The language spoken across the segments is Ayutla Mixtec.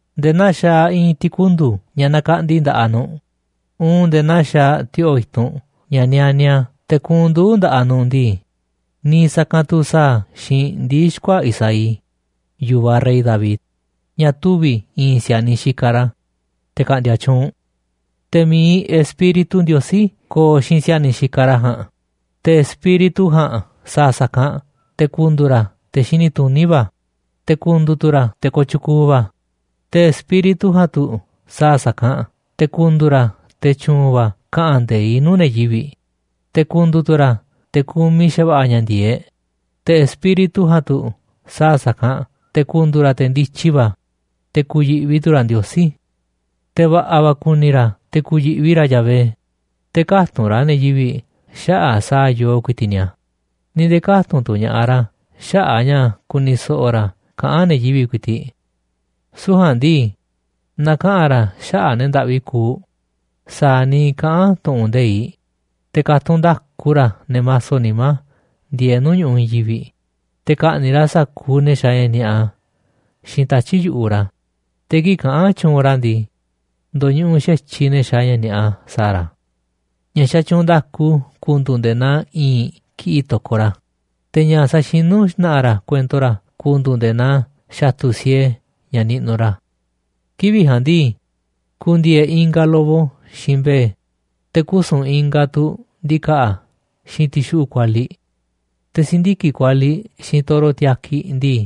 Nde̱e̱ naa xaaꞌ i̱i̱n ti̱kundu̱ ña̱ nakaꞌndi nda̱ꞌaꞌ nu̱ꞌ uunꞌ nde̱e̱ naa xaaꞌ ti̱o̱ꞌo̱ i̱tunꞌ ña̱ nianiaꞌ a̱ te̱ kuunꞌ nduu̱ꞌ nda̱ꞌaꞌ nuꞌ ndii, niiꞌ sa̱kanꞌ tu̱ sa̱a̱ a̱ xiinꞌ ndii̱ xkuaa̱ꞌ Isaí, yu̱vaꞌ rey David, ña̱ tuvi̱ i̱i̱n si̱a̱niꞌ xikaꞌ ra̱, te̱ ka̱ꞌndi̱a̱ tyuunꞌ. Te̱ mi̱iꞌ Espíritu Ndiosí ko̱o̱ xiinꞌ si̱a̱niꞌ xikaꞌ ra̱ ja̱a̱nꞌ, te̱ Espíritu ja̱a̱nꞌ sa̱a̱ sa̱kanꞌ te̱ ku̱ndu̱u̱ ra̱ te̱ xini tuní va̱, te̱ ku̱ndu̱u̱ tu̱ ra̱ te̱ kooꞌ tyukuuꞌ va̱, te̱ Espíritu ja̱a̱nꞌ tu̱ sa̱a̱ sa̱kanꞌ te̱ ku̱ndu̱u̱ ra̱ te̱ tyu̱u̱n va̱ kaꞌa̱n nde̱iꞌ nuu̱ꞌ ne̱ yivi̱ꞌ, te̱ ku̱ndu̱u̱ tu̱ ra̱ te̱ kumiꞌ xa̱va̱ꞌa̱ ña̱ ndi̱e̱eꞌ, te̱ Espíritu ja̱a̱nꞌ tu̱ sa̱a̱ sa̱kanꞌ te̱ ku̱ndu̱u̱ ra̱ te̱ ndityi va̱, te̱ ku̱yi̱ꞌvi tu̱ ra̱ Ndiosí. Te̱ va̱ꞌa̱ va̱ ku̱ni̱ ra̱ te̱ ku̱yi̱ꞌvi ra̱ Yahvé, te̱ kä̱tunꞌ ra̱ ne̱ yivi̱ꞌ xaꞌa̱ꞌ sa̱a̱ yoo ku̱i̱ti̱ꞌ ni̱a̱ ni̱ nde̱e̱ kä̱tunꞌ tu̱ ña̱ꞌaꞌ ra̱ xaꞌa̱ꞌ ña̱ ku̱ni̱ so̱ꞌo̱ ra̱ kaꞌán ne̱ yivi̱ꞌ ku̱i̱ti̱ꞌ. Süu̱ꞌ ja̱a̱nꞌ ndii, na̱kaꞌa̱n ra̱ xaꞌa̱ꞌ ne̱ ndaꞌvi kuuꞌ sa̱a̱ niiꞌ kaꞌán tu̱ꞌu̱n nde̱iꞌ, te̱ ka̱tunꞌ nda̱ku ra̱ ne̱ maso nimá ndieeꞌ nuu̱ꞌ ñu̱ꞌuꞌ i̱i̱n yivi̱ꞌ, te̱ ka̱ꞌni̱ꞌ ra̱ sa̱kuuꞌ ne̱ xaaꞌ ña̱ ni̱a̱ꞌa xiinꞌ tatyi̱ꞌ yu̱ꞌuꞌ ra̱, te̱ kii̱ꞌ kaꞌa̱n tyuunꞌ ra̱ ndii, ndo̱ñuꞌuꞌ xa̱tyiꞌ ne̱ xaaꞌ ña̱ ni̱a̱ꞌa sa̱a̱ ra̱. Ña̱ xatyuunꞌ nda̱ku ku̱ndu̱u̱ nde̱e̱ naa i̱i̱nꞌ kiꞌiꞌ to̱koꞌ ra̱, te̱ ña̱ saxinú xna̱ꞌa̱ ra̱ kuento ra̱ ku̱ndu̱u̱ nde̱e̱ naa xa̱tu̱ siee ña̱ niꞌnuꞌ ra̱. Kivi̱ꞌ ja̱a̱nꞌ ndii, ku̱ndi̱e̱e̱ ingaꞌ lobo xiinꞌ mbe̱e̱, te̱ kusu̱n ingaꞌ tu̱ ndi̱ka̱ꞌa̱ xiinꞌ ti̱xuꞌu̱ꞌ kualiꞌ. Te̱ si̱ndiki̱ꞌ kualiꞌ xiinꞌ toro tiakiꞌ ndii,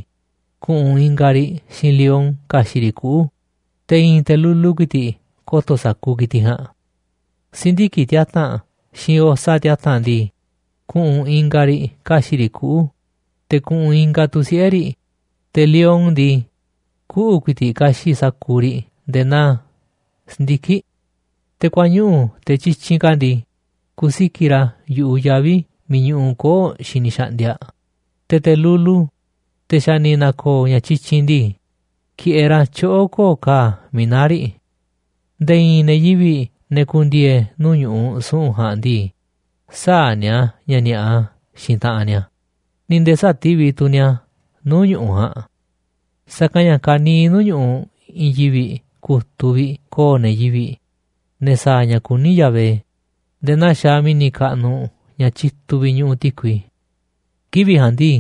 ku̱ꞌu̱n ingaꞌ riꞌ xiinꞌ lion ka̱xi̱ꞌ riꞌ kuꞌu̱, te̱ i̱i̱n te̱ lulu ku̱i̱ti̱ꞌ ko̱to̱ sa̱kuuꞌ ki̱tiꞌ ja̱a̱nꞌ. Si̱ndiki̱ꞌ tiata̱nꞌ xiinꞌ osa tiata̱nꞌ ndii, ku̱ꞌu̱n ingaꞌ riꞌ ka̱xi̱ꞌ riꞌ kuꞌu̱, te̱ ku̱ꞌu̱n ingaꞌ tu̱ siꞌe̱ riꞌ, te̱ lion ndii, kuꞌu̱ ku̱i̱ti̱ꞌ ka̱xi̱ꞌ sa̱kuuꞌ riꞌ nde̱e̱ naa si̱ndiki̱ꞌ. Te̱ kuañuꞌu̱, te̱ tyityinꞌ ka̱ ndii, ku̱siki̱ꞌ ra̱ yu̱ꞌuꞌ yavi̱ miiꞌ ñuꞌuꞌ koo̱ꞌ xiniꞌ xaꞌndiaꞌ, te̱ te̱ lulu, te̱ xa̱ ni̱ na̱ko̱o̱ ña̱ tyityinꞌ ndii, ki̱ꞌeꞌ ra̱ tyoꞌo̱ koo̱ꞌ ka̱a̱ miiꞌ naá riꞌ. Nde̱e̱ i̱i̱n ne̱ yivi̱ꞌ, ne̱ ku̱ndi̱e̱e̱ nuu̱ꞌ ñu̱ꞌuꞌ su̱ꞌu̱n ja̱a̱nꞌ ndii, sä̱a̱ ni̱a̱ ña̱ ni̱a̱ꞌa xiinꞌ taꞌanꞌ ni̱a̱ ni̱ nde̱e̱ sä̱tíviꞌ tu̱ ni̱a̱ nuu̱ꞌ ñu̱ꞌuꞌ ja̱a̱nꞌ. Sa̱kanꞌ ña̱ ka̱niiꞌ nuu̱ꞌ ñu̱ꞌuꞌ i̱i̱n yivi̱ꞌ ku̱tuꞌ vi̱ꞌ ko̱o̱ ne̱ yivi̱ꞌ, ne̱ sa̱a̱ ña̱ kuní Yahvé, nde̱e̱ naa xaaꞌ mi̱ni̱ kaꞌnuꞌ ña̱ tyituꞌ vi̱ꞌ ñuꞌuꞌ ti̱kui. Kivi̱ꞌ ja̱a̱nꞌ ndii,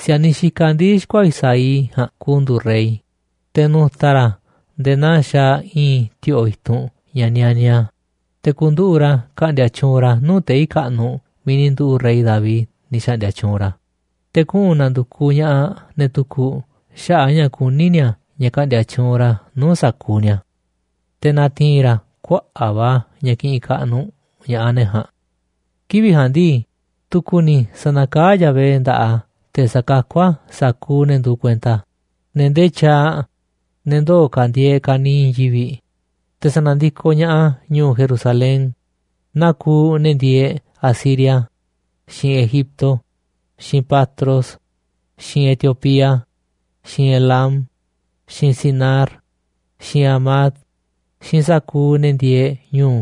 si̱a̱niꞌ xikaꞌ ndii̱ xkuaa̱ꞌ Isaí ja̱a̱nꞌ ku̱ndu̱u̱ rey, te̱ nu̱ta̱ ra̱ nde̱e̱ naa xaaꞌ i̱i̱n ti̱o̱ꞌo̱ i̱tunꞌ ña̱ nianiaꞌ a̱, te̱ ku̱nduꞌu̱ꞌ ra̱ ka̱ꞌndi̱a̱ ra̱ tyuunꞌ nuu̱ꞌ tei̱ kaꞌnuꞌ miiꞌ ni̱ nduꞌu̱ꞌ rey David ni̱ xa̱ꞌndi̱a̱ tyuunꞌ ra̱. Te̱ kuꞌu̱n na̱ndu̱kuꞌ ña̱ꞌaꞌ ne̱ tukuꞌ xaꞌa̱ꞌ a̱ ña̱ kuní ni̱a̱ ña̱ ka̱ꞌndi̱a̱ tyuunꞌ ra̱ nuu̱ꞌ sa̱kuuꞌ ni̱a̱, te̱ na̱ti̱i̱n ra̱ kuaꞌa̱ꞌ va̱ ña̱ kiꞌinꞌ ña̱ꞌaꞌ ne̱ ja̱a̱nꞌ. Kivi̱ꞌ ja̱a̱nꞌ ndii, tu̱ku̱ ni̱ sa̱na̱kaá Yahvé nda̱ꞌaꞌ a̱ te̱ sa̱kakú a̱ sa̱kuuꞌ ne̱ nduuꞌ kuenta a̱, ne̱ ndee tyaaꞌ, ne̱ ndoo̱ ka̱ ndieeꞌ ka̱niiꞌ i̱i̱n yivi̱ꞌ, te̱ sa̱na̱ndikoꞌ ña̱ꞌaꞌ a̱ ñu̱u̱ Jerusalén, naa kuuꞌ ne̱ ndieeꞌ Asiria, xiinꞌ Egipto, xiinꞌ Patros, xiinꞌ Etiopía, xiinꞌ Elam, xiinꞌ Sinar, xiinꞌ Hamat, xiinꞌ sa̱kuuꞌ ne̱ ndieeꞌ ñu̱u̱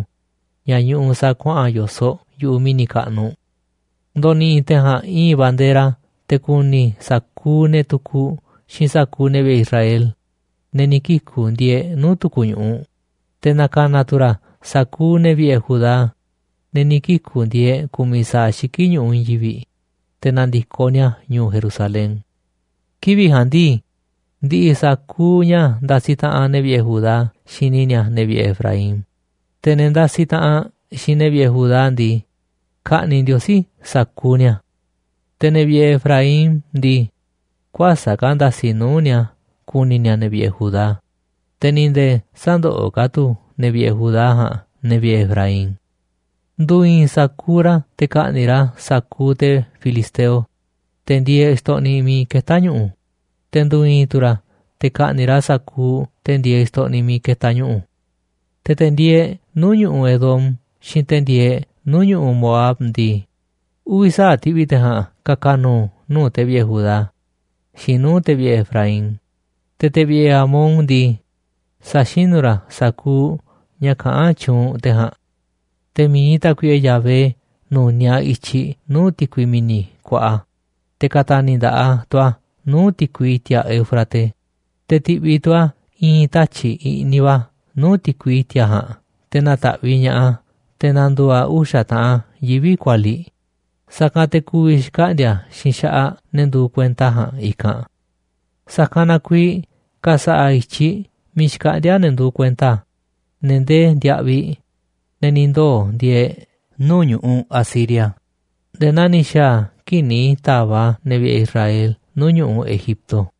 ña̱ ñuꞌuꞌ sa̱a̱ kuaꞌa̱n yo̱soꞌ yu̱ꞌuꞌ mi̱ni̱ kaꞌnuꞌ. Ndo̱ni̱ꞌi̱ te̱ ja̱a̱nꞌ i̱i̱n bandera te̱ ku̱ni̱ sa̱kuuꞌ ne̱ tukuꞌ xiinꞌ sa̱kuuꞌ ne̱ vi̱ꞌe̱ Israel, ne̱ ni̱ kiku̱ ndieeꞌ nuu̱ꞌ tu̱ku̱ ñu̱ꞌuꞌ, te̱ na̱ka̱na̱ tu̱ ra̱ sa̱kuuꞌ ne̱ vi̱ꞌe̱ Judá, ne̱ ni̱ kiku̱ ndieeꞌ ku̱miꞌ saaꞌ xiki̱ꞌ ñu̱ꞌuꞌ i̱i̱n yivi̱ꞌ, te̱ na̱ndi̱koꞌ ni̱a̱ ñu̱u̱ Jerusalén. Kivi̱ꞌ ja̱a̱nꞌ ndii, ndi̱ꞌi̱ sa̱kuuꞌ ña̱ ndasiꞌ taꞌanꞌ ne̱ vi̱ꞌe̱ Judá xini ni̱a̱ ne̱ vi̱ꞌe̱ Efraín, te̱ ne̱ ndasiꞌ taꞌanꞌ xiinꞌ ne̱ vi̱ꞌe̱ Judá ndii, ka̱ꞌni̱ꞌ Ndiosí sa̱kuuꞌ ni̱a̱. Te̱ ne̱ vi̱ꞌe̱ Efraín ndii, kuäsa̱ꞌ ka̱ nda̱si̱ꞌ nuu̱ꞌ ni̱a̱ ku̱ni̱ ni̱a̱ ne̱ vi̱ꞌe̱ Judá, te̱ ni̱ nde̱e̱ sä̱ndoꞌoꞌ ka̱ tu̱ ne̱ vi̱ꞌe̱ Judá ja̱a̱nꞌ ne̱ vi̱ꞌe̱ Efraín. Ndu̱i̱i̱n sa̱kuuꞌ ra̱, te̱ ka̱ꞌni̱ꞌ ra̱ sa̱kuuꞌ te̱ filisteo, te̱ ndieeꞌ xtoꞌniꞌ miiꞌ ketá ñu̱ꞌu̱, te̱ ndu̱i̱i̱n tu̱ ra̱ te̱ ka̱ꞌni̱ꞌ ra̱ sa̱kuuꞌ te̱ ndieeꞌ xtoꞌniꞌ miiꞌ ketaꞌ ñu̱ꞌu̱. Te̱ te̱ ndieeꞌ nuu̱ꞌ ñu̱ꞌuꞌ Edom xiinꞌ te̱ ndieeꞌ nuu̱ꞌ ñu̱ꞌuꞌ Moab ndii, uvi̱ sa̱aꞌ ti̱ꞌvi̱ te̱ ja̱a̱nꞌ ka̱ka̱ nu̱u̱ nuu̱ꞌ te̱ vi̱ꞌe̱ Judá xiinꞌ nuu̱ꞌ te̱ vi̱ꞌe̱ Efraín, te̱ te̱ vi̱ꞌe̱ Amón ndii, sa̱xinu̱ ra̱ sa̱kuuꞌ ña̱ kaꞌán tyuunꞌ te̱ ja̱a̱nꞌ. Te̱ mi̱iꞌ Tákuiꞌe Yahvé nu̱niaꞌ i̱tyiꞌ nuu̱ꞌ ti̱kui mi̱ni̱ kuaꞌa, te̱ ka̱ta̱ni̱ nda̱ꞌaꞌ tu̱ a̱ nuu̱ꞌ ti̱kui i̱ti̱a̱ Eufrate, te̱ ti̱ꞌviꞌ tu̱ a̱ i̱i̱n tatyi̱ꞌ i̱ꞌniꞌ va̱ nuu̱ꞌ ti̱kui i̱ti̱a̱ ja̱a̱nꞌ, te̱ na̱ta̱ꞌviꞌ ña̱ꞌaꞌ a̱ te̱ na̱ndu̱u̱ a̱ uxa̱ taꞌan yivi̱ꞌ kualiꞌ, sa̱kanꞌ te̱ ku̱vi̱ xkaꞌndi̱a̱ xiinꞌ xaꞌaꞌ ne̱ nduuꞌ kuenta a̱ ja̱a̱nꞌ i̱kanꞌ. Sa̱kanꞌ na kuiiꞌ ka̱sa̱ꞌa̱ a̱ i̱tyiꞌ miiꞌ xkaꞌndi̱a̱ ne̱ nduuꞌ kuenta a̱, ne̱ ndee ndiaꞌviꞌ, ne̱ ni̱ ndoo̱ ndieeꞌ nuu̱ꞌ ñu̱ꞌuꞌ Asiria, nde̱e̱ naa ni̱ xa̱a̱ a̱ kii̱ꞌ ni̱ ta̱va̱ꞌ a̱ ne̱ vi̱ꞌe̱ Israel nuu̱ꞌ ñu̱ꞌuꞌ Egipto.